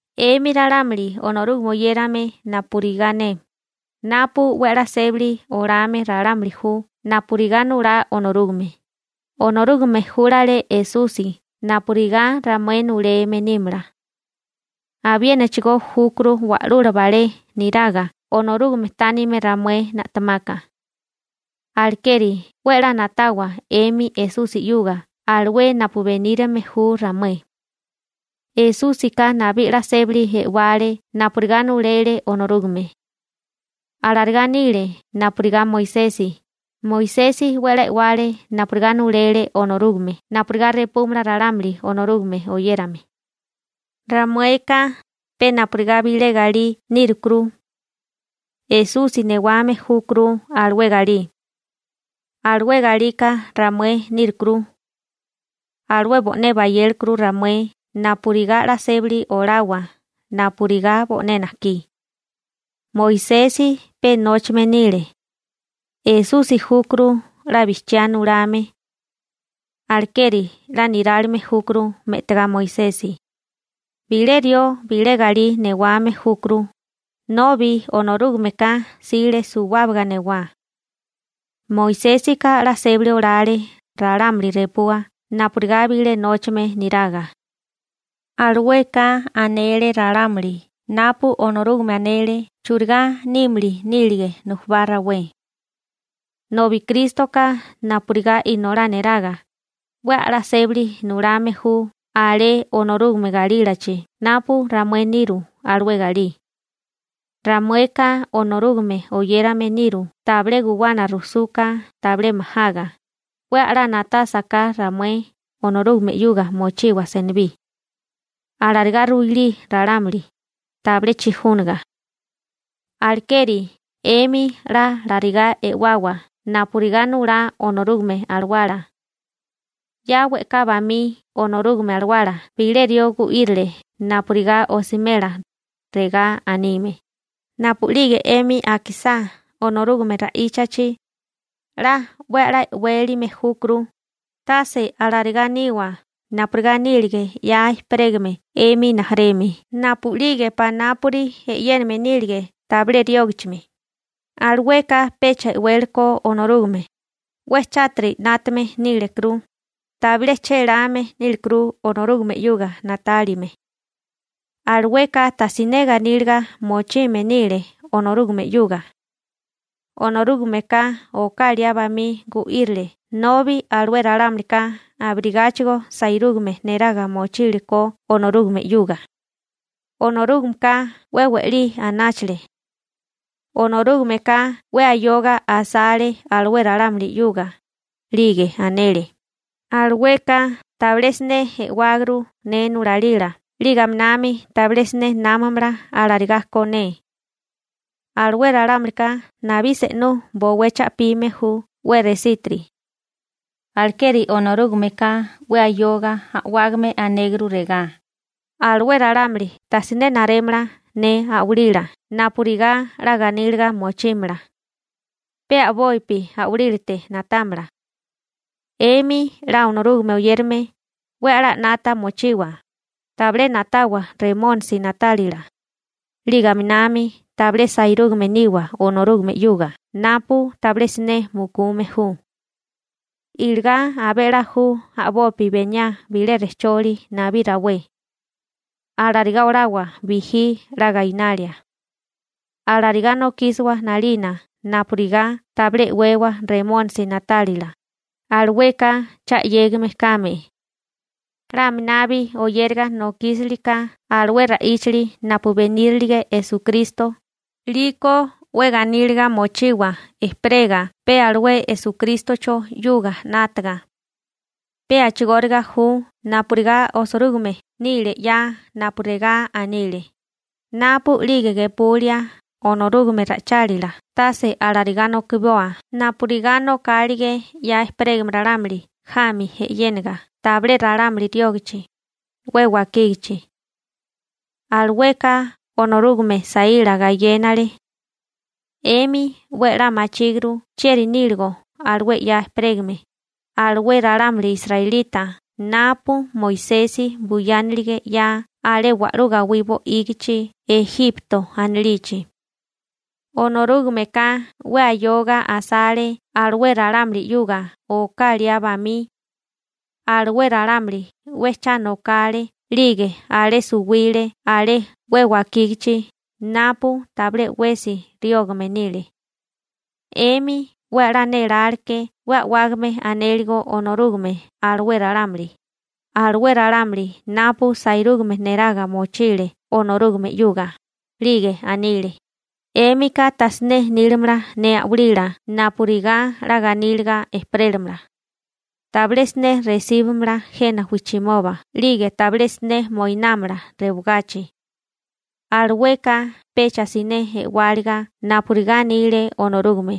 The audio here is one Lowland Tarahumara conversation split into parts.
'Emi ralámuli Onorúgame oyérame napurigá ne, napu 'we a'lá sébali olame ralámuli ju napurigá nulá Onorúgame, Onorúgame júlale Esusi napurigá ramué nuleme nímala. Abiénachigó júkuru wa'lula balé neraga Onorúgame tánime ramué na'temaka. Alekeri 'we 'la na'tawa 'emi Esusi 'yuga alué napu benírime ju ramué. Esúsika nabí 'la sébali e'wale napurigá nulele Onorúgame. Alarigá nile napurigá Moisesi, Moisesi 'we a'lá e'wale napurigá nulele Onorúgame napurigá repúmala ralámuli Onorúgame oyérame. Ramueka pe napurigá bilé galí nírukuru. Esusi newame júkuru alué galí. Alué galika ramué nírukuru. Alué bo'né bayékuru ramué napurigá 'la sébali olawa napurigá bo'né najkí. Moisesi pe nóchame nile. Esusi júkuru 'la bijchiá nulame. Alekeri 'la nirálime júkuru me'tigá Moisesi. Bilé rió bilé galí newame júkuru, nobi Onorúgameka 'sile suwábaga newá. Moisésika 'la sébali olale ralámuli repua napurigá bilé nóchame niraga. Alueka anele ralámuli napu Onorúgame anele churigá nímili nílige nujubá rawé. Nobi Krístoka napurigá inolá niraga, 'we a'lá sébali nulame ju alé Onorúgame galílachi napu ramué niru alué galí. Ramueka Onorúgame oyérame niru tabilé guwana rusuka tabilé majaga, 'we a'lá na'tásaká ramué Onorúgame 'yuga mochiwa senibí. Alarigá ruilí ralámuli, tabilé chijúniga. Alekeri 'emi 'la alarigá e'wawa napurigá nulá Onorúgame Alawala. 'Ya we'ká bamí Onorúgame Alawala bilé rió gu'írile napurigá osimela, regá anime: Napu'lige 'emi akisá Onorúgame ra'íchachi, 'la 'we a'lá e'wélime júkuru, tase alarigá niwa napurigá nílige 'ya ejperégame 'emi rijimala napu'lige panápuri e'yéname nílige tabilé riógichimi, alueka pecha e'wéleko Onorúgame, 'we chátiri 'nátame nílekuru, tabilé chéláme nílikuru Onorúgame 'yuga na'tálime. Alueka tajsiné ganíliga mochime nile Onorúgame 'yuga. Onorúgameka oká liá bamí gu'írile nobi alué ralámulika abirigáchigo sairúgame neraga mochíleko Onorúgame 'yuga. Onorúgameka 'we we'lí anáchale. Onorúgameka 'we ayoga asale alué ralámuli 'yuga, 'lige anele: «Alueka tabilé siné e'wáguru ne nulalila 'lige aminami tabilé siné námamala alarigá ko ne. Alué ralámulika nabí se'nú bowé cha'pime ju 'we resítiri.» Alekeri Onorúgameka 'we ayoga a'wágame anéguru regá: Alué ralámuli tajsiné narémala ne a'walila napurigá 'la ganíliga mochímala. Pe a'bopi a'walílate na'támala. 'Emi 'la Onorúgame oyérame, 'we a'lá 'nata mochiwa, tabilé na'tawa Remónisi na'tálila, 'lige aminami tabilé sairúgame niwa Onorúgame 'yuga napu tabilé siné mukume ju. Iligá abé 'la ju a'bopi beniá bilé rejcholi nabí rawé. Alarigá olawa bijí 'la gainalia. Alarigá nokísiwa 'nalina napurigá tabilé e'wewa Remónisi na'tálila, alueka cha 'yégime kame. 'La aminabi oyériga nokísili ka alué ra'íchali napu benírilige Esukristo, 'liko 'we ganíliga mochiwa ejperega pe alué Esukrístocho 'yuga 'nátaga. Pe a'chigóriga ju napurigá osirúgime nile 'ya napu regá anile: Napu'lige gepulia Onorúgame ra'ichálila tase alarigá nokiboa napurigá nokálige 'ya ejperégame ralámuli jami e'yéniga tabilé ralámuli riógachi, 'we wakígachi. Alueka Onorúgame saíla gayénale. 'Emi 'we 'la machíguru chieri níligo alué 'ya ejperégame, alué ralámuli israelita napu Moisesi buyánilige 'ya alé wa'lú gawí bo'ígichi Ejipto anilichi. Onorúgameka 'we ayoga asale alué ralámuli 'yuga oká liá bamí. Alué ralámuli 'we cha nokale 'lige alé suwile alé 'we wakígachi napu tabilé 'wesi riógame nile. 'Emi 'we a'lá néláleke 'we a'wágame anéligo Onorúgame alué ralámuli, alué ralámuli napu sairúgame neraga mochile Onorúgame 'yuga. 'Lige anile: «'Émika tajsiné nílamala ne a'walila napurigá 'la ganíliga ejperélamala. Tabilé siné resíbimala jena wijchimoba 'lige tabilé siné moinámala rewagachi.» Alueka pecha siné e'wáliga napurigá anile Onorúgame,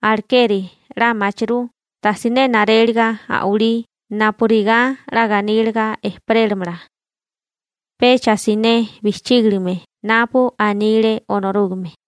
alekeri 'la machirú tajsiné naréliga a'walí napurigá 'la ganíliga ejperélamala. Pecha siné bijchígilime napu anile Onorúgame.